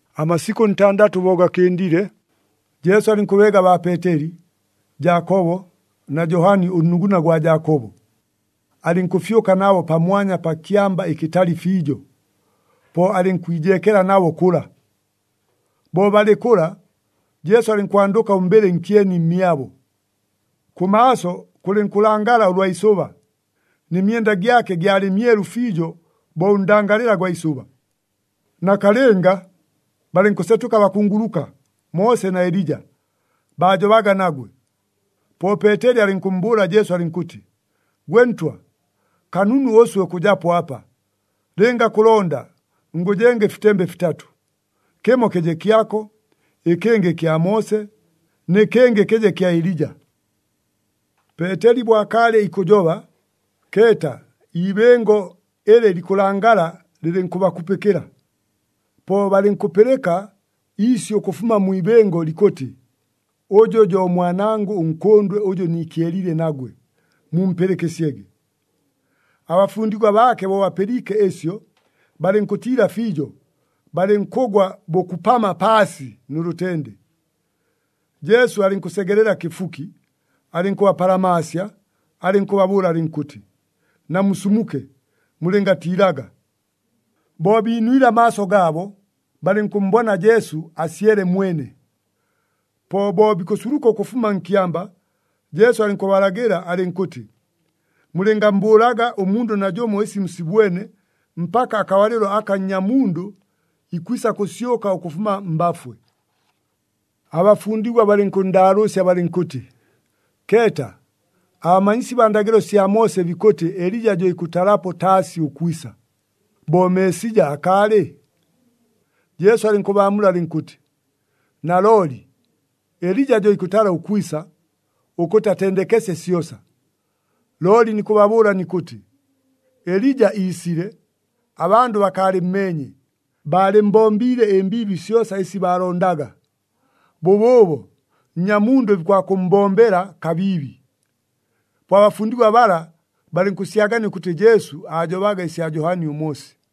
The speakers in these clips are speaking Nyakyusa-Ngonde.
Amasikʉ ntandatʉ bo gakɨndile, Jesu alɨnkʉbeega baa Peeteli, Jaakobo na Johani ʉnnuguna gwa Jaakobo. Alɨnkʉfyʉka nabo pamwanya pa kyamba ɨkɨtali fiijo, po alɨnkwijeekela nabo kʉla. Bo balɨ kʉla, Jesu alɨnkwandʉka ʉmbɨlɨ nkyeni mmyabo. Kʉmaaso kʉlɨnkʉlangala ʉlwa isʉba, nɨ myenda gyake gyalɨ myelu fiijo bo ʉndangalɨla gwa isʉba. Nakalɨnga, balɨnkʉsetʉka abakunguluka Moose na Elija, baajobaga nagwe. Po Peeteli alɨnkʉmmbʉʉla Jesu alɨnkʉtɨ, “Gwe Ntwa, kanunu ʉswe ʉkʉjapo apa. Lɨnga kʉlonda, ngʉjenga ɨfitembe fitatʉ. Kɨmo kɨje kyako, ɨkɨngɨ kya Moose, nɨ kɨngɨ kɨje kya Elija.” Peeteli bo akaalɨ ikʉjoba, keeta, iibɨngo ɨlɨ likʉlangala lɨlɨnkʉbakupɨkɨla. Po balɨnkʉpɨlɨka iisyʉ ʉkʉfuma mwi ibɨngo likʉtɨ, “Ʉjʉ jo Mwanangʉ ʉNkʉndwe ʉjʉ niikyeliile nagwe, mumpɨlɨkɨsyege!” Abafundigwa baake bo bapɨliike ɨsyo, balɨnkʉtiila fiijo, balɨnkʉgwa bʉkupama paasi nʉ lʉtende. Jesu alɨnkʉsegelela kɨfuki, alɨnkʉbapalamaasya, alɨnkʉbabʉʉla alɨnkʉtɨ, “Namusumuke, mulɨngatiilaga!” Bo biinwile amaaso gaabo, balɨnkʉmmbona Jesu asyele mwene. Po bo bikʉsuluka ʉkʉfuma nkyamba, Jesu alɨnkʉbalagɨla alɨnkʉtɨ, “Mulɨngammbʉʉlaga ʉmundʉ najʉmo ɨsi musibwene mpaka akabalɨlo aka Nnyamundʉ ikwisa kʉsyʉka ʉkʉfuma mbafwe.” Abafundigwa balɨnkʉnndaalʉʉsya balɨnkʉtɨ, “Keeta, abamanyisi baa ndagɨlo sya Moose bikʉtɨ Elija jo ikʉtalapo taasi ʉkwisa, bo Meesija akaalɨ?” Jesu alɨnkʉbaamula alɨnkʉtɨ, “Nalooli Elija jo ikʉtala ʉkwisa, ʉkʉtɨ atendekesye syosa. Looli nikʉbabʉʉla nikʉtɨ, Elija iisile, abandʉ bakaalɨmmeenye, baalɨmmbombiile ɨmbiibi syosa ɨsi baalondaga. Bʉbʉʉbo Nnyamundʉ bikwakʉmmbombela kabiibi.” Po abafundigwa bala balɨnkʉsyagania ʉkʉtɨ Jesu aajobaga ɨsya Johani ʉMoosi.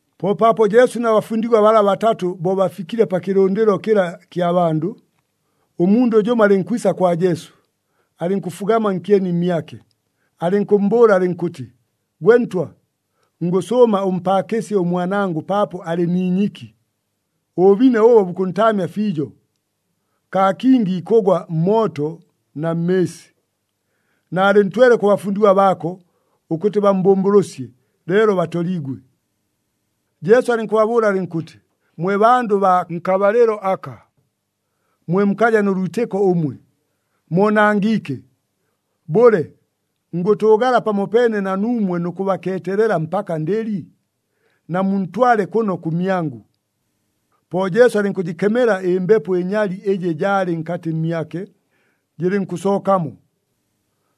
Po paapo Jesu na bafundigwa bala batatʉ bo bafikile pa kɨlʉndɨlo kɨla kya bandʉ, ʉmundʉ jʉmo alɨnkwisa kwa Jesu, alɨnkʉfugama nkyeni mmyake, alɨnkʉmmbʉʉla alɨnkʉtɨ, “Gwe Ntwa, ngʉsʉʉma ʉmpaakɨsye ʉmwanangʉ paapo alɨ ni inyiki, ʉbʉbine ʉbo bukʉntaamya fiijo. Kaa kingi ikʉgwa mmooto na mmɨɨsi. Naalɨntwele kʉ bafundigwa baako ʉkʉtɨ bammbʉmbʉlʉsye, leelo batoliigwe.” Jesu alɨnkʉbabʉʉla alɨnkʉtɨ, “Mwe bandʉ baa nkabalɨlo aka, mwe mukaja nʉ lwitɨko ʉmwe! Moonangiike! Bʉle, ngʉtʉʉgala pamopeene na nuumwe nʉ kʉbakeetelela mpaka ndɨli? Namuntwale kʉno kʉmyangʉ!” Po Jesu alɨnkʉjɨkemela ɨmbepo ɨnyali ɨjɨ jaalɨ nkatɨ mmyake, jɨlɨnkʉsookamo.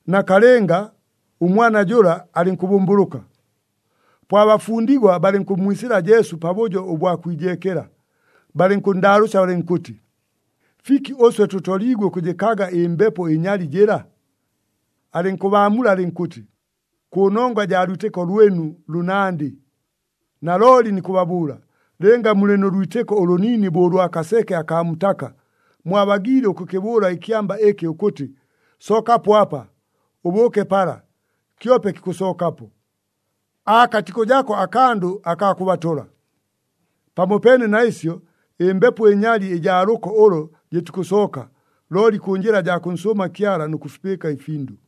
Nakalɨnga, ʉmwana jʉla alɨnkʉbʉmbʉlʉka. Po abafundigwa balɨnkʉmmwisɨla Jesu pabʉjo ʉbwa kwijeekela, balɨnkʉnndaalʉʉsya balɨnkʉtɨ, “Fiki ʉswe tʉtoliigwe ʉkʉjɨkaga ɨmbepo ɨnyali jɨla?” Alɨnkʉbaamula alɨnkʉtɨ, “Kʉnongwa jaa lwitɨko lwɨnu lʉnandɨ. Nalooli nikʉbabʉʉla, lɨnga mulɨ nʉ lwitɨko ʉlʉniini bo ʉlwa kaseke akaa mutaka, mwabagiile ʉkʉkɨbʉʉla ɨkyamba ɨkɨ ʉkʉtɨ, ‘Sookapo apa, ʉbʉʉke pala,’ kyope kikʉsookapo. Aakatikʉjako akandʉ akaa kʉbatola. [ Pamopeene na ɨsyo, ɨmbepo ɨnyali ɨjaa lʉko ʉlo jɨtikʉsooka, looli kʉ njɨla jaa kʉnsʉʉma Kyala nʉ kʉfipɨɨka ɨfindʉ.]”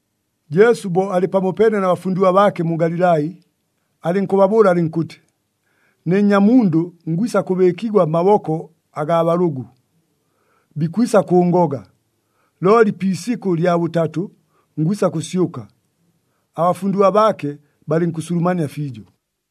Jesu bo alɨ pamopeene na bafundigwa baake mu Galilai, alɨnkʉbabʉʉla alɨnkʉtɨ, “Ne Nnyamundʉ ngwisa kʉbɨɨkigwa mmaboko agaa balʉgʉ. Bikwisa kʉʉngoga, looli pi isikʉ lya bʉtatʉ, ngwisa kʉsyʉka.” Abafundigwa baake balɨnkʉsulumania fiijo.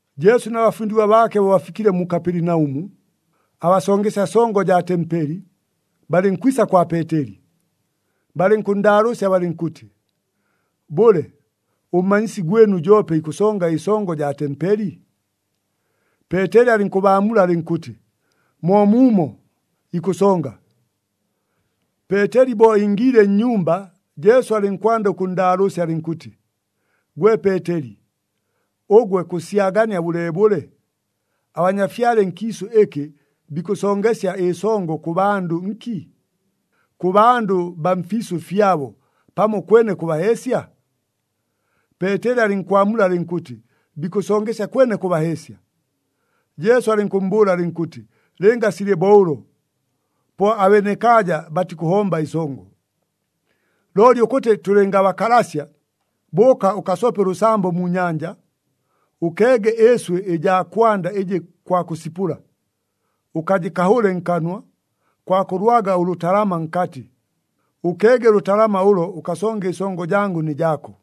Jesu na bafundigwa baake bo bafikile mu Kapelinaʉmu, abasongesya songo jaa tempeli balɨnkwisa kwa Peeteli. Balɨnkʉnndaalʉʉsya balɨnkʉtɨ, “Bʉle, ʉmmanyisi gwɨnu joope ikʉsonga ɨsongo jaa tempeli?” Peeteli alɨnkʉbaamula alɨnkʉtɨ, “Moomuumo, ikʉsonga.” Peeteli bo ingiile nnyumba, Jesu alɨnkwanda ʉkʉnndaalʉʉsya alɨnkʉtɨ, “Gwe Peeteli, ʉgwe kʉsyagania bʉleebʉle? Abanyafyale nkiisʉ ɨkɨ bikʉsongesya ɨsongo kʉ bandʉ nki? Kʉ bandʉ baa mfiisʉ fyabo, pamo kwene kʉ baheesya?” Peeteli alɨnkwamula alɨnkʉtɨ, “Bikʉsongesya kwene kʉ baheesya.” Jesu alɨnkʉmmbʉʉla alɨnkʉtɨ, “Lɨnga silɨ bo ʉlo, po abenekaaja batikʉhomba ɨsongo. Looli ʉkʉtɨ tʉlɨngabakalasya, bʉʉka ʉkasope ʉlʉsambo mu nyanja. Ʉkeege ɨɨswɨ ɨjaa kwanda ɨjɨ kwakʉsipʉla, ʉkajɨkahʉle nkanwa, kwakʉlwaga ʉlʉtalama nkatɨ. Ʉkeege ʉlʉtalama ʉlo ʉkasonge ɨsongo jangʉ nɨ jaako.”